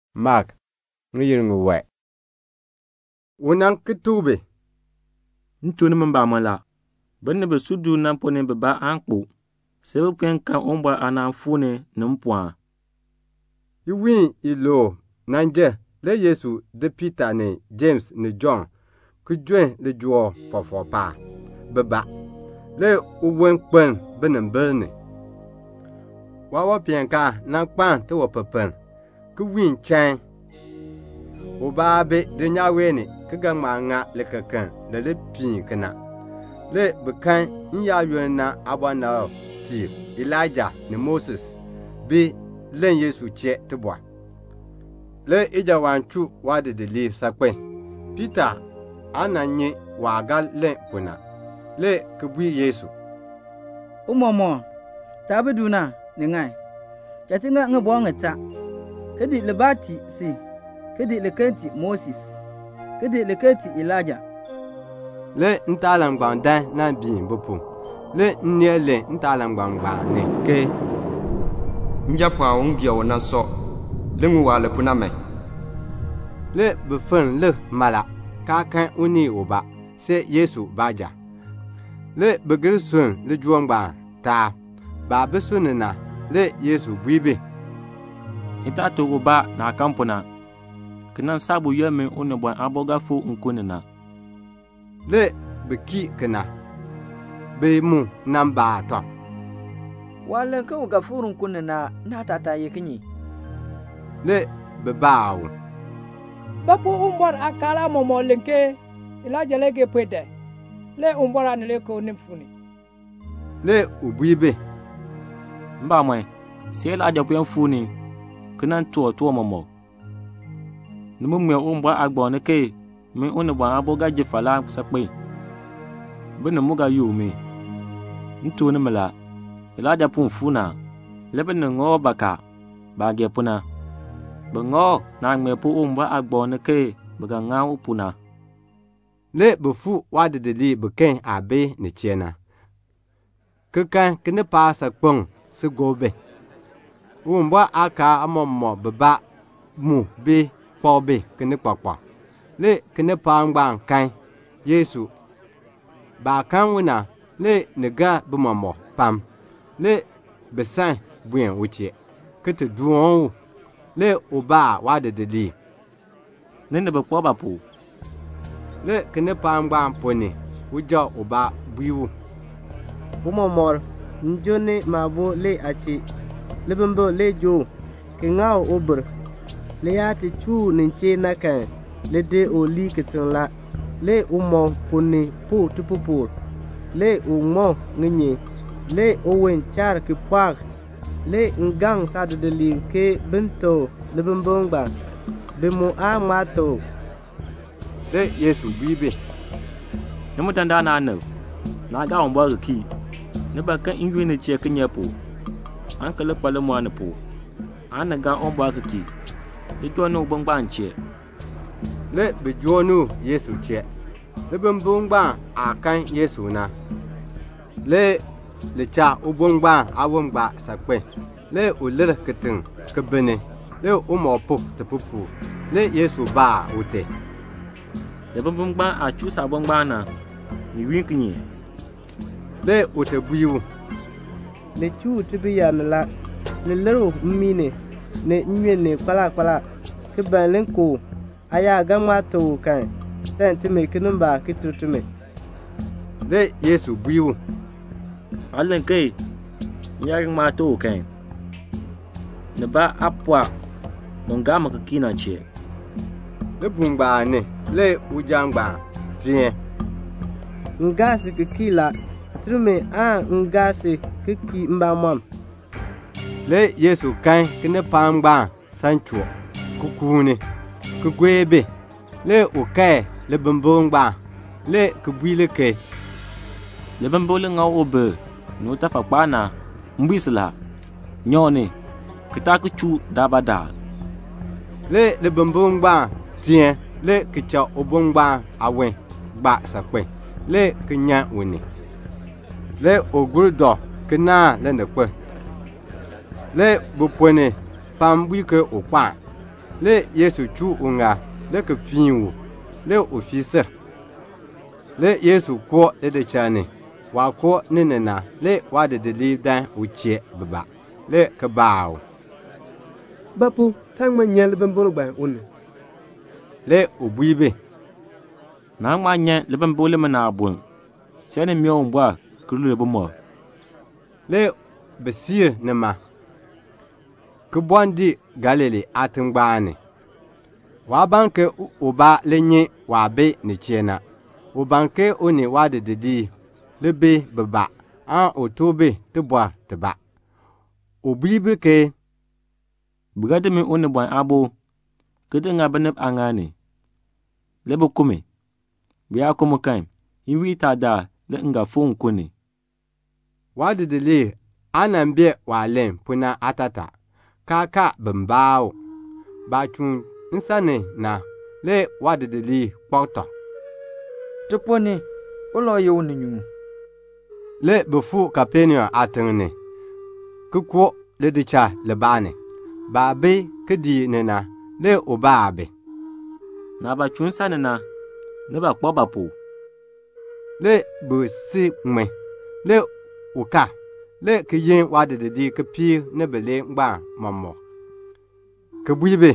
Le u nan ki tuk bi, "M tuk nimi mbamɔn la, binib bi si du na ponn ni bibaa aan kpo see bi puen kan Uwumbɔr aanaan fuu ni ni mpɔɔn." Le iwiin iluub jer a. Le Yesu di Piita ni Jems ni Jɔnn le ki di jon lijool fɔfɔk paab, bibaa. Le uwon kpeln binimbil ni. Le waawanpeenkaan kpaln tiwanpipiln, ki wiin chain. Ubaa aa bi dulnyaa wee ni, ki ga ŋma ŋa likekeln li li piin kena. Le bi kan n-yaayoonn na aabɔnabtiib Elaija ni Moses bi len Yesu chee tibɔr. Le ijawaan chuu waadidiliib saakpen. Piita aa nyi waah ga len pu na. Le u bui Yesu, "Tiicha, taah bi du na, ni ŋan. Cha ti ŋa ŋibɔk ŋitaa, ki di libaa ki tii si, ki di liken ki tii Moses, ki di liken ki tii Elaija." Le ntaalangbam dan nan biin bi pu. Le nneel len ntaalangbam na ni, "Njapɔɔn u m gee u na sɔ. Li ŋun waah len pu na man." Le bi fenn lik mala, kaa kan unii ubaa, see Yesu baanja. Le bi gir sunn ni lijool ngbaan taab. Baah bi sunni na, le Yesu bui bi, "Ni taa tuk ubaa naah kan pu na, ki nan saa buyoonn min Unibɔn Aabo ga fikr nkun ni na." Le bi kii kena. Bi mu baa tɔb, "Waah len ke u ga fikr nkun ni na, naatataa ye kinye?" Le bi baa u, "Ba pu Uwumbɔr aakaal aamɔmɔkb len ke Elaija le ga puen dan, le Uwumbɔr Aanileekoo nin fuu ni?" Le u bui bi, "Mbamɔn, see Elaija puen fuu ni ki nan toor tiwan mɔmɔk. Ni mu ŋmee Uwumbɔr aagbaŋ ni ke min Unibɔn Aabo ga ji falaa saakpen. Binib mu ga yook mi. M tuk nimi la, Elaija puen fuu ni a. Le binib ŋa u bakaa, baah gee pu na. Bi ŋa u naah ŋmee pu Uwumbɔr aagbaŋ ni ke bi ga ŋa u pu na." Le bi fuu waadidiliib biken aah bi nin chee na, ki kan kinipaak saakpeŋ si gob bi. Uwumbɔr aakaal aamɔmɔkb bibaa mu bi kpak bi kinikpakpak. Le kinipaak ngbaan kan Yesu. Baah kan u na, le ni gar bi mɔmɔk pam. Le bi san buen u chee, le ki ti doon u. Le u baa waadidiliib, "Ni ni bi kpak ba pu?" Le kinipaak ngbaan ponn ni, uja ubaa bui u, "Tiicha, m joo ni maabo le aa chee. Libimbikl le joo u, ki ŋa u ubir. Laah chuu u nin chee na, li di u lii kitiŋ la. Le umɔb ponn ni puk tipupukr, le u ŋma ŋinyin. Le uwon chaar ki pɔɔk. Le m gaŋ saadidiliib ke bin teb u libimbikl ngbaan. Bi mu aa ŋma teb u." Le Yesu bui bi, "Nimi dandana aanib, naa gaa Uwumbɔr ki kii. Ni ban ke m yunn ni chee kinye pu, aan ki li kpa limɔr ni pu, aan ni gaa Uwumbɔr ki kii. Li joo ni ubo ngbaan m chee." Le bi joo ni u Yesu chee. Le libimbikl ngbaan aah kan Yesu na, li cha ubo ngbaan aawon gbaa saakpen. Le u lir kitiŋ, ki binni. Le umɔb puk tipupukr. Le Yesu baa ute, "Libimbikl ngbaan aah chuu saabo ngbaan na, ni yunn kinye?" Le ute bui u, "Li chuu u tibir ni la. Le li lir u mmii ni, ni nnyun ni, kpaala kpaala, ki ban li ku u. Aa yaa ga ŋma teb u kan, sam timi kinimbaak ki ter timi." Le Yesu bui u, "Aa len ke, 'M yaa ga ŋma teb u kan.' Nibaa aa pɔɔ un gaa mi ki kii na chee." Libuul ngbaan ni le uja ngbaan teen, "M gaa si ki kii la. Ter mi aan m gaa si ki kii mbamɔm." Le Yesu kan ke kinipaak ngbaan san choo, ki kuuni, ki gue bi. Le u kae libimbikl ngbaan, le ki bui li ke, "Libimbikl li ŋa u ubir ni utafakpaa na, m bui si la, nyan u ni, ki taa ki chuu u daalbaadaal." Le libimbikl ngbaan teen, le ki cha ubo ngbaan aawon gbaa saakpen, le ki nyan u ni. Le u dɔ ki naahn lininkpol. Le bi ponn ni pam bui ke u kpo a. Le Yesu chuu uŋaal, le ki fiin u. Le u fii sil. Le Yesu koo lidichal ni. Waah koo ni na, le waadidiliib nan dan u chee bibaa, le ki baa u, "Ba pu taa ŋma nyan libimbikl ngbaan u ni?" Le u bui bi, "Naan ŋma nyan libimbikl limina aaboln, see ni mee Uwumbɔr [ki lul bumɔb]." Le bi siir nima, le ki bɔɔ dii Galilee aatingbaan ni. Waa ban ke ubaa li nyi waah bi nin chee na; u ban ke u ni waadidiliib li bi bibaa, un tuk bi tibɔr tibaa. U bui bi ke "Bi ga di min Unibɔn Aabo, ki di ŋa binib aaŋaal ni, le bi ku mi. Bi yaa ku mi kan, iwiin itaa daal le m ga fikr nkun ni." Waadidiliib aa bee waah len pu na aatataa, kaa kaar bin baa u. Baah chuun nsan ni na, le waadidiliib kpak tɔb, "Ti ponn ni, ulau tee ye uninyuun?" Le bi fuu Kapenaum aatiŋ ni, le ki koo lidichal libaa ni. Baah bi kidiik ni na, le u baa bi, "Naah chuun nsan ni na, ni kpak ba pu?" Le bi si ŋmin. Le u kal, le ki yin waadidiliib kipiik ni bilee ngbaan mɔmɔk, le ki bui bi,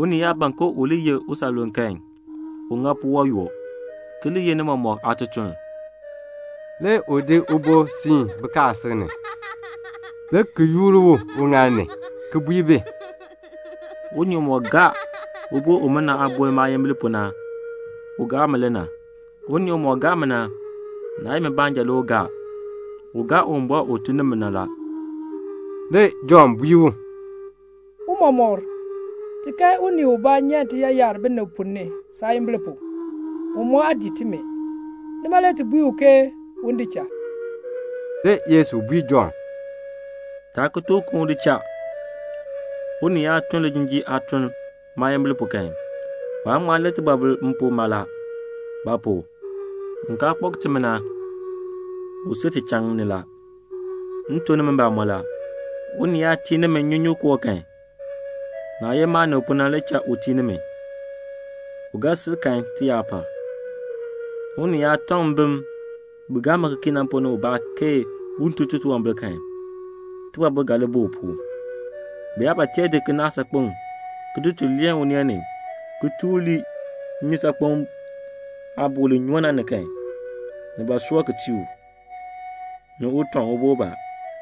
"Unii yaa ban ke u li ye usanluln kan, un ŋa puwɔb yoo, ki li ye ni mɔmɔk aatutuln." Le u di ubo ki di siin bikaasisik ni, le ki yoor u uŋaal ni, le ki bui bi, "Unii umɔk gaa ubo umina aaboln maayimbil pu na, u gaa mi le na. Unii umɔk gaa mi na, naa ye mi baanja le u gaa, u gaa Uwumbɔr u tun ni mi na la." Le Jɔnn bui u, "Tiicha, ti kan unii ubaa nyan tiyaayar binib ponn ni saayimbil pu. U mu aa dii timi, nima le ti bui u ke un di cha." Le Yesu bui Jɔnn, "Taa ki tuk u ke un di cha. Unii yaa tun lijinjiir aatuln maayimbil pu kan, waan ŋma len tibɔbil m pu mala. Ba pu? un kaa kpak timi na, u si ti pu la. M tuk nimi mbamɔn la, unii yaa tii nimi nnyunyunkoo kan, naah ye maanib pu na le cha u tii nimi, u ga sil kan tiyaapar." "Mbim bi gaa mi ki kii na, unii yaa tɔŋ bi ponn ni ubaa ke un tun titunwambir kan, tibɔbil ga li bi u pu. Bi yaa ba tee di kinaak saakpeŋ, ki di tul leen uneen ni, ki tur u lii nnyusaakpem aabuul li nyoo na ni kan, ni soor ki tii u, ni u tɔŋ ubo ubaa.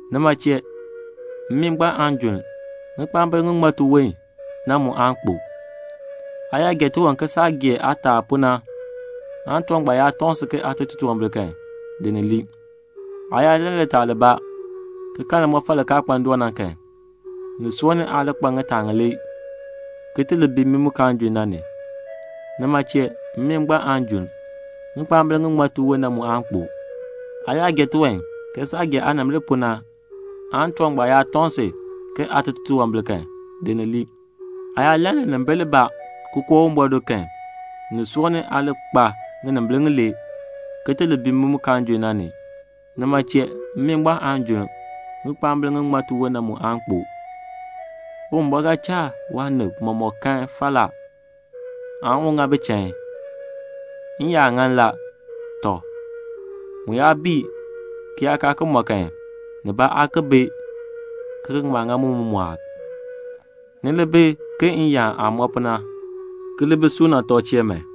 Nima chee, 'mmii ngbaan aan junn. Ŋikpaambil ŋi ji tiwon na mu aan kpo.'] Aa yaa gee tiwan ke saah gee aataal pu na kan, tiwan ngbaan yaa tɔŋ si ke aa tun titunwambir kan, di ni lii. Aa yaa lann litaal libaa, ki kan limɔfal li kaa kpa ndoon na kan, ni soor ni aa li kpa ŋitaa ŋilee, ki ti li bi mmii mu kaan junn na ni. [ Nima chee, 'mmii ngbaan aan junn. Ŋikpaambil ŋi ji tiwon na mu aan kpo.'] Aa yaa gee tiwan ke saah gee aanimbil pu na kan, tiwan ngbaan yaa tɔŋ si ke aa tun titunwambir kan, di ni lii. Aa yaa lann linimbil libaa ki koo Uwumbɔr do kan, ni soor ni aa li kpa ŋinimbil ŋilee, ki ti li bi mmii mu kaan junn na ni. Nima chee, 'mmii ngbaan aan junn. Ŋikpaambil ŋi ji tiwon na mu aan kpo.' "Uwumbɔr ga cha waanib mɔmɔk kan falaa, aan u ŋa bi chain. N-yaan ŋan la. Mu yaa bii ki yaa kaa ki mɔ kan, nibaa aa bi ki ga ki ŋma ŋa mu aan mu mɔɔk. Ni li bi ke n-yaan aah mɔ pu na, ki li bi suuna tɔb chee man."